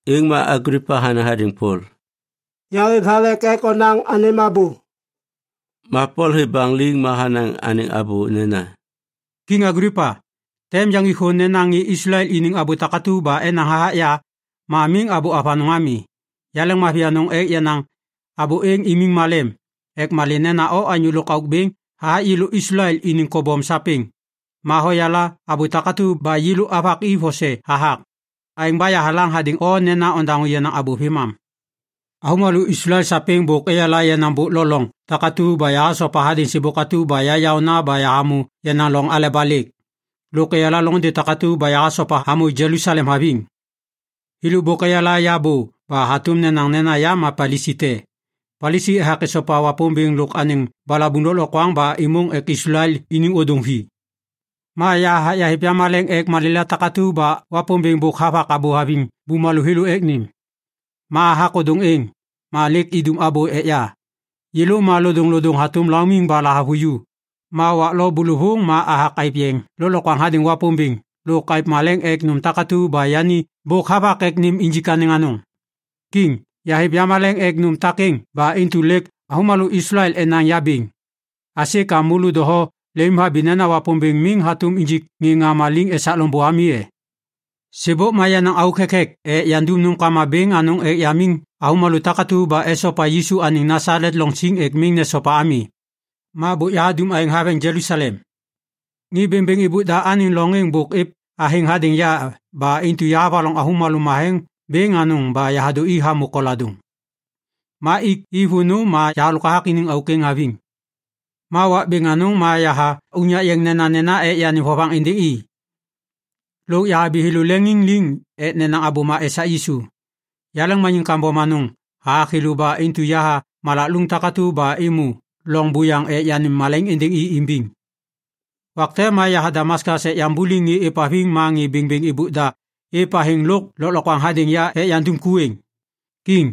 Êŋ ma Aglipa hanaŋ hadêŋ Pol, “Yahêv thalek ek onaŋ anêm abô.” Ma Pol hêv baŋ liŋ ma hanaŋ anêŋ abô nena, “Kiŋ Aglipa, tem yaŋgik thô nena ŋê Islael iniŋ abô takatu ba enaŋ hathak ya ma miŋ abô avanôŋ ami. Yaleŋmavi anôŋ ek yanaŋ abô êŋ imiŋ malem ek malê nena o ma anyô lôkauk bêŋ hathak yêlô Islael iniŋ kobom sapêŋ. Ma hoyala abô takatu ba yêlô avak i vose hathak. Aêŋ ba yahalaŋ hadêŋ o nena ondaŋô yenaŋ abô vêmam. “Avômalô Islael sapêŋ bôk eyala yenaŋ bôk lo loŋ takatu ba yahasopa hadêŋ sêbôk atu ba ya yaôna ba yahamô yenaŋ loŋ aleba lêk. Lôk eyala loŋôndê takatu ba yahasopa hamô Jelusalem haviŋ. Thêlô bôk eyala ya bô ba hatôm nenaŋ nena ya ma Palisi te. Palisi ethak esopa Wapômbêŋ lôk anêŋ balabuŋ lôklokwaŋ ba êmôŋ ek Islael iniŋ ôdôŋ vi. Ma yahathak yahêv yamaleŋ ek malêla takatu ba Wapômbêŋ bôk havak abô haviŋ bumalô thêlô ek nêm. Ma hathak ôdôŋ êŋ, ma lêk idum abô ek ya. Yêlô ma lodôŋlodôŋ hatôm laumiŋ ba lahavuju, ma wak lo bôlôvôŋ ma athak aêv yeŋ lôklokwaŋ hadêŋ Wapômbêŋ lôk aêv maleŋ ek nôm takatu ba yani bôk havak ek nêm injik anêŋ anôŋ. Kiŋ, yahêv yamaleŋ ek nôm takêŋ ba intu lêk avômalô Islael enaŋ ya bêŋ. Aisê ka môlô doho lemimhabi nena Wapômbêŋ miŋ hatôm injik ŋê ŋama liŋ esak loŋbô ami e? “Sêbôk ma yenaŋ auk thekthek ek yandum nômkama bêŋ anôŋ ek yamiŋ avômalô takatu ba esopa Yisu anêŋ Nasalet loŋ siŋ ek miŋ nesopa ami. Ma bôk yahadum aêŋ haveŋ Jelusalem. Ŋê bêŋbêŋ êbôk da anêŋ loŋ êŋ bôk êv athêŋ hadêŋ ya ba intu yahavaloŋ avômalô matheŋ bêŋ anôŋ ba yahadô i hamô koladôŋ. Ma ik i vônô ma yahalôk hathak iniŋ auk êŋ haviŋ. Ma wak bêŋ anôŋ ma yaha unyak yeŋ nenanena ek yanêm vovaŋ êndêŋ i. Lôk yahabi thêlô leŋiŋ liŋ ek nenaŋ abôma esak Yisu. Yaleŋmaniŋ kambom anôŋ hathak thêlô ba intu yaha malak lôŋ takatu ba êmô loŋ buyaŋ ek yanêm malaiŋ êndêŋ i imbiŋ. “Wak te ma yaha Damaskas ek yambuliŋ ŋê êvhaviŋ ma ŋê bêŋbêŋ êbôk da êv athêŋ lôk lôklokwaŋ hadêŋ ya ek yandum ku êŋ. Kiŋ,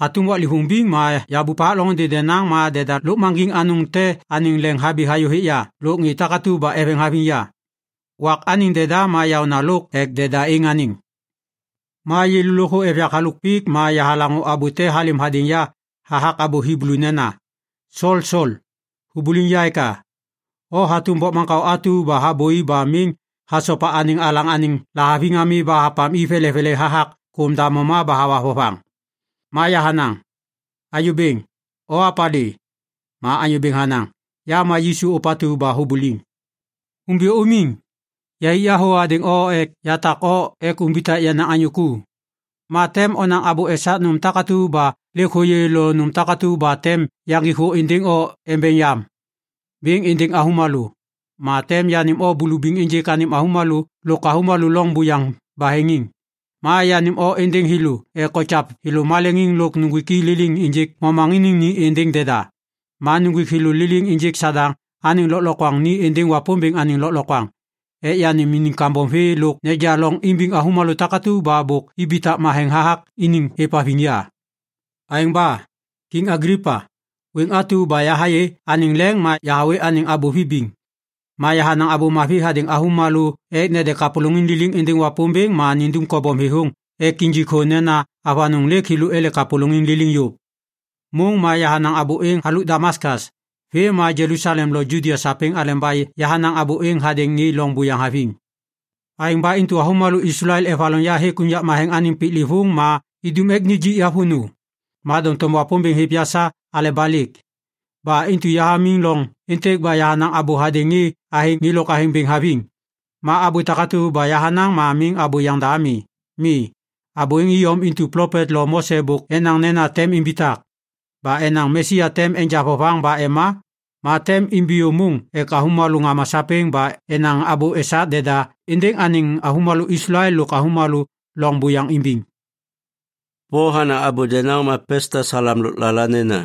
hatôm waklêvôŋ biŋ ma yahabup hathak loŋôndê denaŋ ma deda lôkmaŋgiŋ anôŋ te anêŋ leŋ habi hayô hêk ya lôk ŋê takatu ba eveŋ haviŋ ya. Wak anêŋ deda ma yaôna lôk ek deda êŋ anêŋ. Ma yêlô lôkthô êv yak halôk pik ma yahalaŋô abô te halêm hadêŋ ya hathak abô Hiblu nena, ‘Sol, Sol, hubuliŋ ya eka? O hatôm bokmaŋkao atu ba habôi ba miŋ hasopa anêŋ alaŋ anêŋ lahaviŋ ami ba hapam i velevele hathak kôm damoma ba hawa vovaŋ.’ “Ma yahanaŋ, ‘Anyô Bêŋ, o opalê?’ “Ma Anyô Bêŋ hanaŋ, ‘Ya ma Yisu atu ba hubuliŋ. Umbiyô umiŋ. Yahik ya thô hadêŋ o ek yatak o ek umbitak yenaŋ anyô ku. Ma tem onaŋ abô esak nôm takatu ba lêk hôyê lôk nôm takatu ba tem yaŋgik thô êndêŋ o embeŋ yam bêŋ êndêŋ avômalô. Ma tem yanêm o bulubiŋ ênjêk anêm avômalô lôk avômalô loŋ buyaŋ baheŋiŋ. Ma yanêm o êndêŋ thêlô ek okyav thêlô maleŋiŋ lôk nuŋgwik i liliŋ ênjêk momaŋiniŋ ni êndêŋ deda. Ma nuŋgwik thêlô liliŋ ênjêk Sadaŋ anêŋ lôklokwaŋ ni êndêŋ Wapômbêŋ anêŋ lôklokwaŋ ek yanêm iniŋ kambom vê lôk neja loŋ imbiŋ avômalô takatu ba bôk ibitak matheŋ hathak iniŋ êvhaviŋ ya.’ “Aêŋ ba, Kiŋ Aglipa, wêŋ atu ba yahayê anêŋ leŋ ma yahawê anêŋ abô vibiŋ. Ma yahanaŋ Abô Mavi hadêŋ avômalô ek nede kapôlôŋiŋ liliŋ êndêŋ Wapômbêŋ ma nindum kobom thêthôŋ ek injik thô nena avanôŋ lêk ele kapôlôŋiŋ liliŋ yôv. Môŋ ma yahanaŋ abô êŋ halôk Damaskas vêm ma Jelusalem lôk Judia sapêŋ aleba yahanaŋ abô êŋ hadêŋ ŋê loŋ buyaŋ haviŋ. Aêŋ ba intu avômalô Islael evaloŋ ya hêk unyak matheŋ anêŋ piklêvôŋ ma idum ek nijik ya vônô. Ma doŋtom Wapômbêŋ hêv ya sa aleba lêk. Ba intu yahamiŋ loŋ êntêk ba yahanaŋ abô hadêŋ ŋê athêŋ mi lôk ŋê athêŋ bêŋ haviŋ. Ma abô takatu ba yahanaŋ ma miŋ abô yaŋda ami. Mi, abô êŋ iyom intu plopet lo Mose bôk enaŋ nena tem imbitak. Ba enaŋ Mesia tem enja vovaŋ ba ema, ma tem imbiyô môŋ ek avômalô ŋama sapêŋ ba enaŋ abô esak deda êndêŋ anêŋ avômalô Islael lôk avômalô loŋ buyaŋ imbiŋ.” Pol hanaŋ abô denaŋ ma Pestas halam lôklala nena,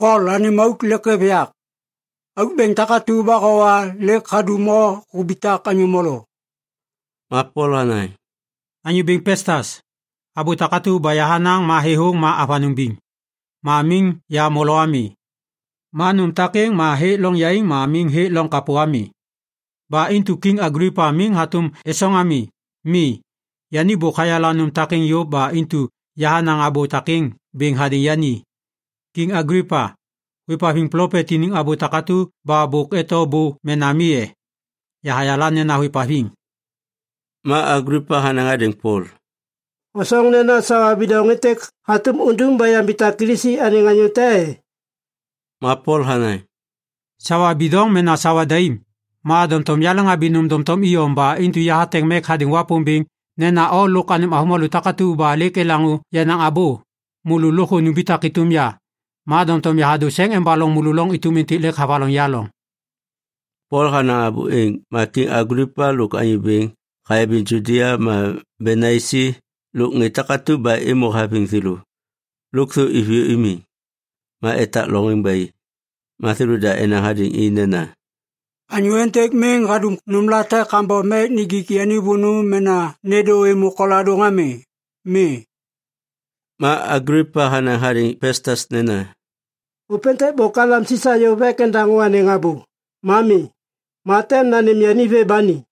“Pol, anêm auk lêk hêv yak! Auk bêŋ takatu ba howa ma lêk hadum o hubitak anyô molo.” Ma Pol hanaŋ, “Anyô bêŋ Pestas, abô takatu ba yahanaŋ ma thêthôŋ ma avanôŋ biŋ. Ma miŋ ya molo ami. Ma nôm takêŋ ma hêk loŋ yaiŋ ma miŋ hêk loŋ kapô ami. Ba intu Kiŋ Aglipa miŋ hatôm êsôŋ ami. Mi, yani bôk hayala nôm takêŋ yôv ba intu yahanaŋ abô takêŋ bêŋ hadêŋ yani. Kiŋ Aglipa, hôêvhaviŋ plopet iniŋ abô takatu ba bôk eto bô mena mi e? Yahayala nena hôêvhaviŋ.” Ma Aglipa hanaŋ hadêŋ Pol, “Hosoŋ nena sawa bidoŋ êntêk hatôm undum ba yambitak Kilisi anêŋ anyô te e?” Ma Pol hanaŋ, “Sawa bidoŋ mena sawa daim, ma doŋtom yaleŋhabi nôm doŋtom iyom ba intu yahateŋ mek hadêŋ Wapômbêŋ nena o lôk avômalô takatu ba lêk elaŋô yenaŋ abô, môlô lôkthô numbitak êtôm ya. Ma doŋtom yahadô seŋ embaloŋ môlô loŋ êtôm êntêk lêk havaloŋ ya loŋ.” Pol hanaŋ abô êŋ, ma Kiŋ Aglipa lôk anyô bêŋ hayabiŋ Judia ma Benaisi lôk ŋê takatu ba êmô haviŋ thêlô, lôkthô iviyô imiŋ ma etak loŋ êŋ ba i. Ma thêlôda enaŋ hadêŋ i nena, “Anyô êntêk miŋ hadum nômlate kambom ek nijik yani vônô mena nêndô êmô koladôŋ ami. Mi.” Ma Aglipa hanaŋ hadêŋ Pestas nena, “Ôpêntêk bôk halam Sisa yôv ek endaŋô anêŋ abô. Ma mi, ma tem nanêm yani vê ba ni.”